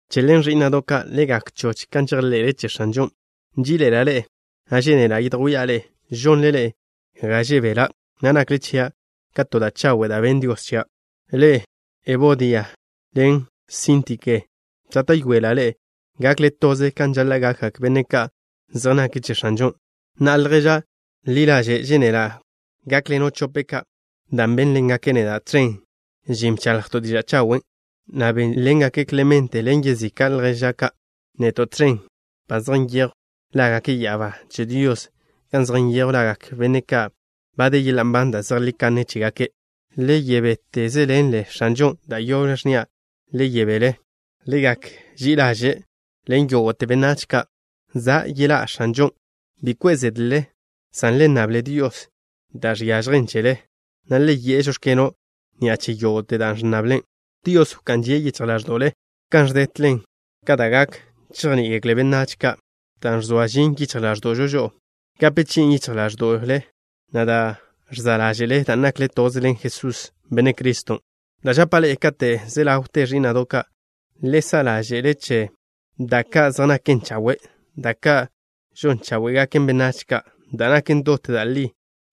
Che ḻen, ẕí'na'do' ka', le gak choch kan žejḻe'le che X̱anžon'. Nží'iḻe'ela' ḻe'e, na' žénela' yedjwía' ḻe'e. Žonle ḻe'e ga žebela', na' nakle chia' ka to da' chawe' da' benn Dios chia'. Ḻe'e, Ebodia ḻen Síntike, žáta'yoela' ḻe'e gakle toze kan žaḻa' gakgak benne' ka' zej nake' che X̱anžon'. Na'a, lježa' ḻi ḻaže', žénela' gákḻeno' chope' ka', dan' bénḻengake' neda' tẕen žin, bchaḻjto' diža' chawen', na' bénḻengak Klemente ḻen yezika' lježa' ka', neto' tẕen. Ba zej nyejw lágake' ya'abá che Dios gan zej nyejw lagak benne' ka' ba de yeḻa' nban da' zejlí kanne chégake'. Le yebétezeḻenle X̱anžon'. Da' yoble, ẕnnia': Le yebél. Le gak ži'i ḻaže' ḻen yógo'te benách ka'. Za' yeḻá' X̱anžon'. Bi kwe' zedle, san le nnable Dios da' žiažjen chele, na' le yi'e: “Žóx̱keno'” ni'a che yógo'te dan' ẕnnable. Dios wká'n žie' yichj ḻáẕdo'le, kan ẕdetlen ka da' gak chejní'igekle benách ka'. Dan' ẕzoa žin yichj ḻáẕdo'žo gape chi'in yichj ḻáẕdo'le, na' da' ẕza' ḻáže'le, dan' nakle toze ḻen Jesús, Benne' Criston'. Da' žapa' ḻe'e kate' ze ḻawte, ẕí'na'do' ka', le sa' ḻáže'le che: Da' ka' zej naken chawe'. Da' ka' žon cháwe'gaken benách ka'. Da' naken dot da' li.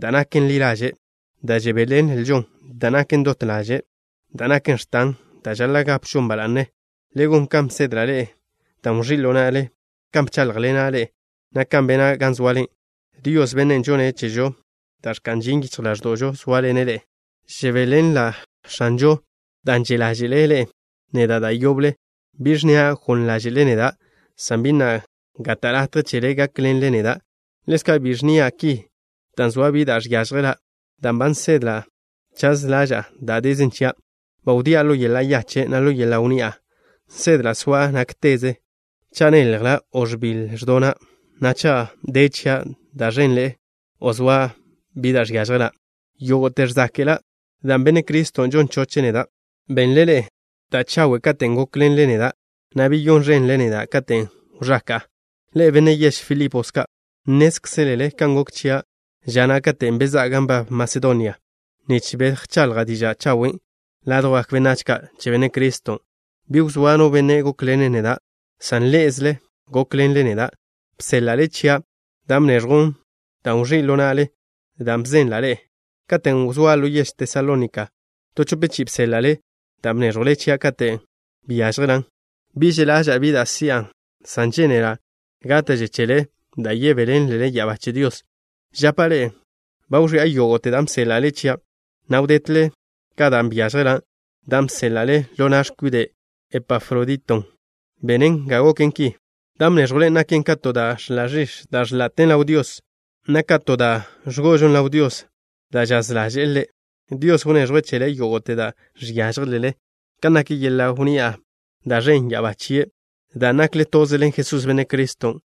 Da' naken ḻi ḻaže'. Da' žebéḻenlžo. Da' naken dot ḻaže'. Da' naken x̱tan. Da' žaḻa' gapžon ba la'ne. Le gon kan bsedla' ḻe'e, dan' wẕí' ḻo na'le, kan bcháḻjḻena' ḻe'e, na' kan bena' gan zoale. Dios, Bennen' žonne' chežo da' ẕka'n žin yichj ḻáẕdo'žo sóaḻene' ḻe'e. Žebéḻenla' X̱anžon' dan' že' ḻáže'le ḻe'e neda' da' yoble. Bi ẕnnia' goḻ ḻáže'le neda', san bi na' gata' latje chele gákḻenle neda'. Ḻezka', bi ẕnnia' ki dan' zoa bi da' žiážjela', dan' ba nsedla' chaz ḻaža'a da' dezen chia'. Ba wdía' ḻo yeḻa' yache', na' ḻo yeḻa' wnni'a. Nsedla' soa' nákteze, cha' neljla' o ẕbiḻ ẕdona', na' cha' de chia' da' ẕenḻe'e o zoa bi da' žiážjela'. Yógo'te ẕzáke'la' dan' Benne' Criston' žon choche' neda'. Benle ḻe'e da' chawe' katen' gókḻenle neda', na' beyón ẕenle neda' katen' wẕaka'a. Ḻe'e, benne' yež Filipos ka', nnézkzelele kan gok chia' ža na' katen' bezá'a gan nbab Masedonia, nich bejchaḻja' diža' chawen'. Ládwjgak benách ka' che Benne' Criston', bi wzóa no benne' gókḻene' neda', san ḻé'ezele gókḻenle neda'. Bséḻa'le chia' dan' bnéẕjwlen, dan' wẕí' ḻo na'le da' bzenla' ḻe'e. Katen' wzóa' ḻo yež Tesalónika, to chope chi'i bséḻa'le dan' bnéẕjwlen chia' katen' byážjelan'. Bi že' ḻaža'a bi da' si'an, san žénela' gáta'že chele da' yebéḻenlelen ya'abá che Dios. Žapa' ḻe'e: ba wẕi'a yógo'te dan' bséḻa'le chia', na' wdetle ka da' byážjela'. Dan' bséḻa'le ḻo na' x̱kwide' Epafroditon' benen ga goken ki. Dan' bnéẕjwlen naken ka to da' ẕḻa' ẕix̱ da' ẕḻa'ten ḻaw Dios, na' ka to da' ẕgo'ožon ḻaw Dios da' žaz ḻaže'e Ḻe'. Dios wneẕjwe' chele yógo'te da' žiážjelele, kan nak yeḻa' wnni'a da' žen' ya'abá chie', dan' nakle toze ḻen Jesús, Benne' Criston'.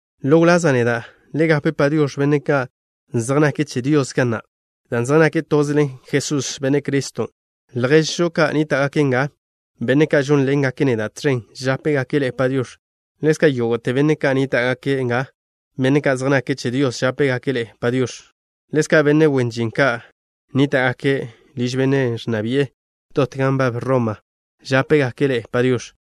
Ḻo wlaza' neda', le gape “Padiox̱” benne' ka' zej nake' che Dios ga na', dan' zej nake' toze ḻen Jesús, Benne' Criston'. Lježžo ka' nníta'gake' nga, benne' ka' žónḻengake' neda' tẕen, žápegake' ḻe'e “Padiox̱.” Ḻezka' yógo'te benne' ka' nníta'gake' nga, benne' ka' zej nake' che Dios, žápegake' ḻe'e “Padiox̱.” Ḻezka' benne' wen žin ka' nníta'gake' liž benne' ẕnna bi'e dot gan nbab Roma žápegake' ḻe'e “Padiox̱.”